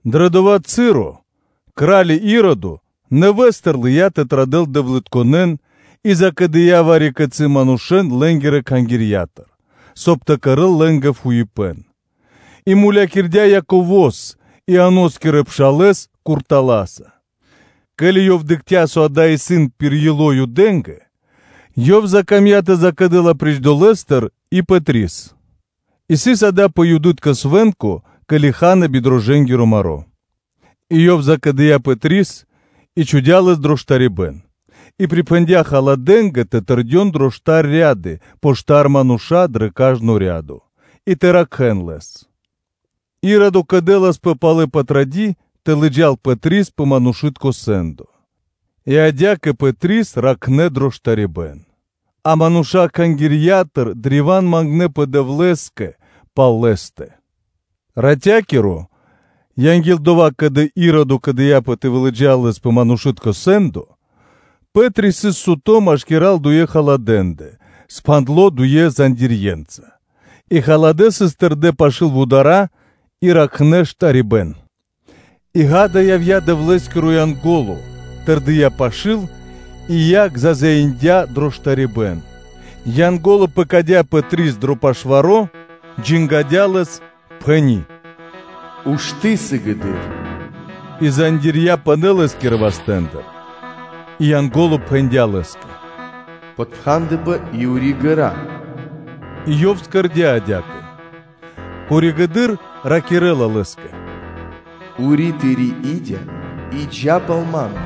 Дрэ дова́ часо кра́ли Иродо нэвэ́стыр лыя́ тэ традэл дэвлытконэн и закэдыя вари-кицы́ манушэ́н лэ́нгирэ кхангирья́тыр, соб (кай) тэ кэрэ́л фуипэ́н лэ́нгэ, И мулякирдя́ Яково́с, Ианоскирэ пшалэ́с куртала́са. Ке́ли ёв дыкхця́, со дава́ исын пир ило́ Юдэ́нгэ, ёв закамдя́ тэ закэдэл апри́ч дова́ и Пэтрис; а сыс дава́ пэ Юды́тко свэ́нко, ке́ли ха́на би рошчынакиро (дрожджэнгиро) маро́. И Ёв закэдыя Пэтрис, и чхудя́ лэс дро штарибэ́н, и припхэндя́ халадэнгэ тэ тэрдён дрэ штар ряды пэ штар манушэ́н дрэ кажно рядо и тэ ракхэ́н лэс; Иродо кэдэласпэ пало́ Патради́ тэ лыджа́л Пэтрис пэ манушы́тко сэ́ндо. И адя́кэ Пэтрис ракхнэ дро штарибэ́н; а мануша́ Кхангирья́тыр древа́н мангнэпэ Дэвлэ́скэ пал лэ́стэ. Ратя́киро, анги́л дова́, ке́ли Иродо кэдыяпэ тэ вылыджал лэс пэ манушы́тко сэ́ндо, Пэ́три сыс суто́ машкира́л дуе халадэ́ндэ, пхандло дуенца зандирьенца, и халадэ́ сыс тэрдэ́ пашы́л вудара́ и ракхнэ штарибэ́н. И, ґа́да, явдя́ Дэвлэ́скиро Янго́ло, тэрдия́ пашы́л, и яг зазяиндя дро штарибэ́н; Янго́ло пэкадя́ Пэтрис дро пашваро, джангадя лэс, пхэни́: “Ушты́ сыгэды́р.” И зандирья́ (цэ́пи) пынэ́ лэ́скирэ вастэ́ндыр. И Янго́ло пхэндя́ лэ́скэ: “Подпхандэпэ и ури ґэра́.” И ёв кэрдя́ адя́кэ. Коригэды́р ракирэ́ла лэ́скэ: “Ури тыри́ и́дя и джа́ пал ма́ндэ.”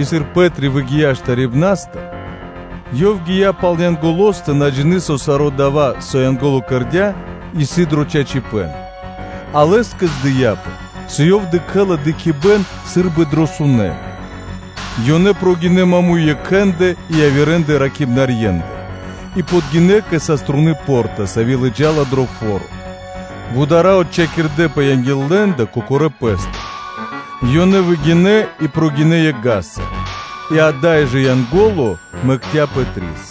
И сыр Пэ́три выгия́ штарибнастыр, ёв гия́ пал Янголостэ, на джины́, со саро́ дава́, со Янго́ло кэрдя́, исын дро чачипэ́н, а лэ́скэ здыяпэ, со ёв дыкхэ́ла дыкхибэ́н сы́рбы дрэ сунэ́. Ёнэ прогинэ́ маму́й екхэндэ и явирэ ракхибнарьендэ и подгинэ́ кэ саструны по́рта, сави́ лыджа́ла дро фо́ро, вудара́ отчхакирдэпэ анги́л лэ́ндэ кокорэ́ пэ́стыр; ёнэ выгинэ́, и прогинэ́ екх вули́ца (га́са), и ада́й жэ Янго́ло мэкця́ Пэтрис.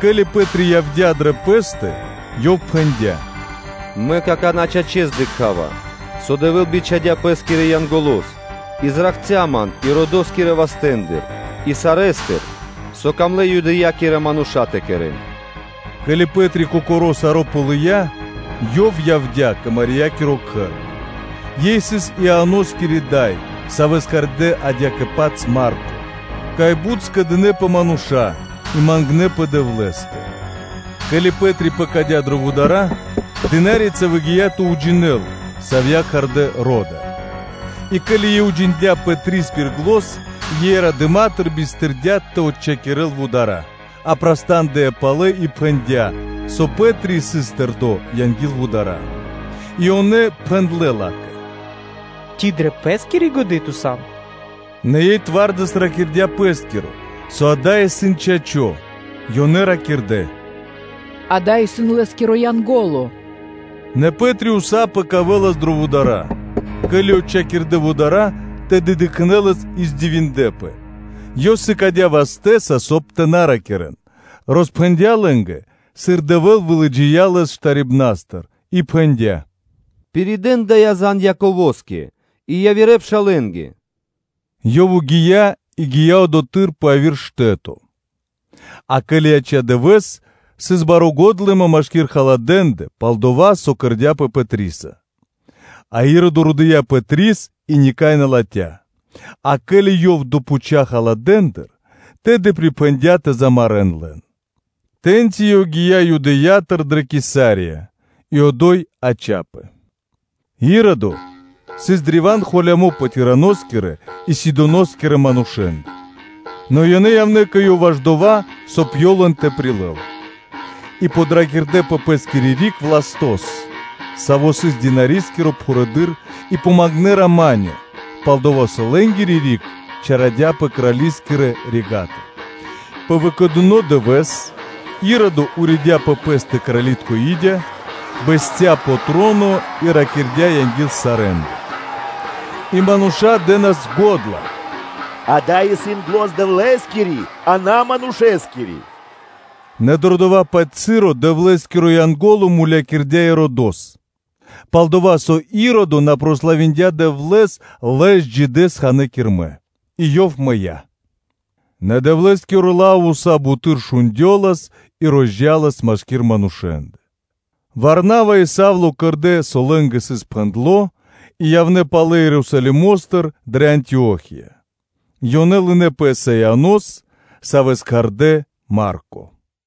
Ке́ли Пэ́три явдя́ дрэ пэ́стэ, ёв пхэндя́: “Мэ какана́, чачэс, дыкха́ва, со Дэвэ́л бичхадя́ Пэ́скирэ Янголо́с и ракхця́ ман Иродоскирэ вастэ́ндыр и сарэ́стыр, со камлэ́ Юдэя́кирэ мануша́ тэ кэрэ́н.” Ке́ли Пэ́три кокоро́ саро́ ґалыя́, ёв явдя́ кэ Мариякиро кхэр, ёй сыс Ианоскири дай, савэ́с кхардэ́ адя́кэ-паць Марко, кай бут скэдынэ́пэ мануша́ и мангнэпэ Дэвлэ́скэ. Ке́ли Пэ́три пэкадя́ дрэ вудара́, дына́рица выгия́ тэ уджинэл, савья́ кхардэ́ Рода; и ке́ли ёй уджиндя́ Пэтрис пири́ зан, ёй радыма́тыр бистырдя тэ отчхакирэл вудара́, а праста́ндыя палэ и пхэндя́, со Пэ́три сыс тэрдо́ анги́л вудара́. И ёнэ пхэндлэ́ ла́кэ: “Ци дрэ пэ́скири годы́ ту сан? Нэ ёй сароекх ракирдя́ пэ́скиро, со дава́ исын чачо́.” Ёнэ ракирдэ́: “Дава́ исын лэ́скиро Янго́ло.” Нэ Пэ́три ўса пэкавэлас дрэ вудара́: ке́ли отчхакирдэ вудара́, тэды дыкхнэ́ лэс и дивиндлэ́пэ. Ёв сыкадя́ вастэ́са, соб (кай) тэ на ракирэ́н, роспхэндя́ лэ́нгэ, сыр Дэвэ́л вылыджия́ лэс штарибнастыр и пхэндя́: “Пиридэ́н дая́ зан Яково́скэ и явирэ пшалэ́нгэ.” Ёв гия́ и гия́ одотхы́р пэ яви́р штэ́то. А ке́ли яця́ дывэ́с, сыс бари годлыма машки́р халадэ́ндэ пал дова́, со кэрдя́пэ Пэтриса. А Иродо родыя Пэтрис и никай на латхя́, а ке́ли ёв допхуця халадэндыр, тэды припхэндя́ тэ мулякирэ́н лэн. Тэ́ньци ёв гия́ Юдэя́тыр дрэ Кесария и одо́й яця́пэ. Иродо сыс древа́н холямо́ пэ Тираноскирэ и Сидоноскирэ манушэ́ндэ; нэ ёнэ явнэ́ кэ ёв ваш дова́, соб (кай) ёв лэн тэ прилэл и подракирдэ пэ пэ́скири риг Властос, саво́ сыс крали́скиро штубатуно (пхурэды́р) и помангнэ “рама́нё (миро)”, пал-дова́ со лэ́нгири риг чарадяпэ крали́скирэ рига́тыр. Пэ выкэдыно дывэ́с Иродо уридя пэ пэ́стэ крали́тко и́дя, бэсця́ пэ троно и ракирдя́ анги́л сарэ́ндэ. И мануша́ дэ́нас го́дла: “Дава́ исын зан Дэвлэ́скири, а на манушэскири.” Нэ дро дова́-паць моменто Дэвлэ́скиро Янго́ло мулякирдя́ Иродос, пал-дова́ со Иродо на славиндя Дэвлэ́с, лэс джидэс ханэ́ кирмэ, и ёв мыя́. Нэ Дэвлэ́скиро лав уса́ буты́р шундёлас и розджалас машки́р манушэ́ндэ. Варнава и Савло кэрдэ́, со лэ́нгэ сыс пхэндло́ и явнэ́ палэ Ерусалимо́стыр дрэ Антио́хия; ёнэ лынэ́ Пэ́са Ианос, савэ́с кхардэ́ “Марко.”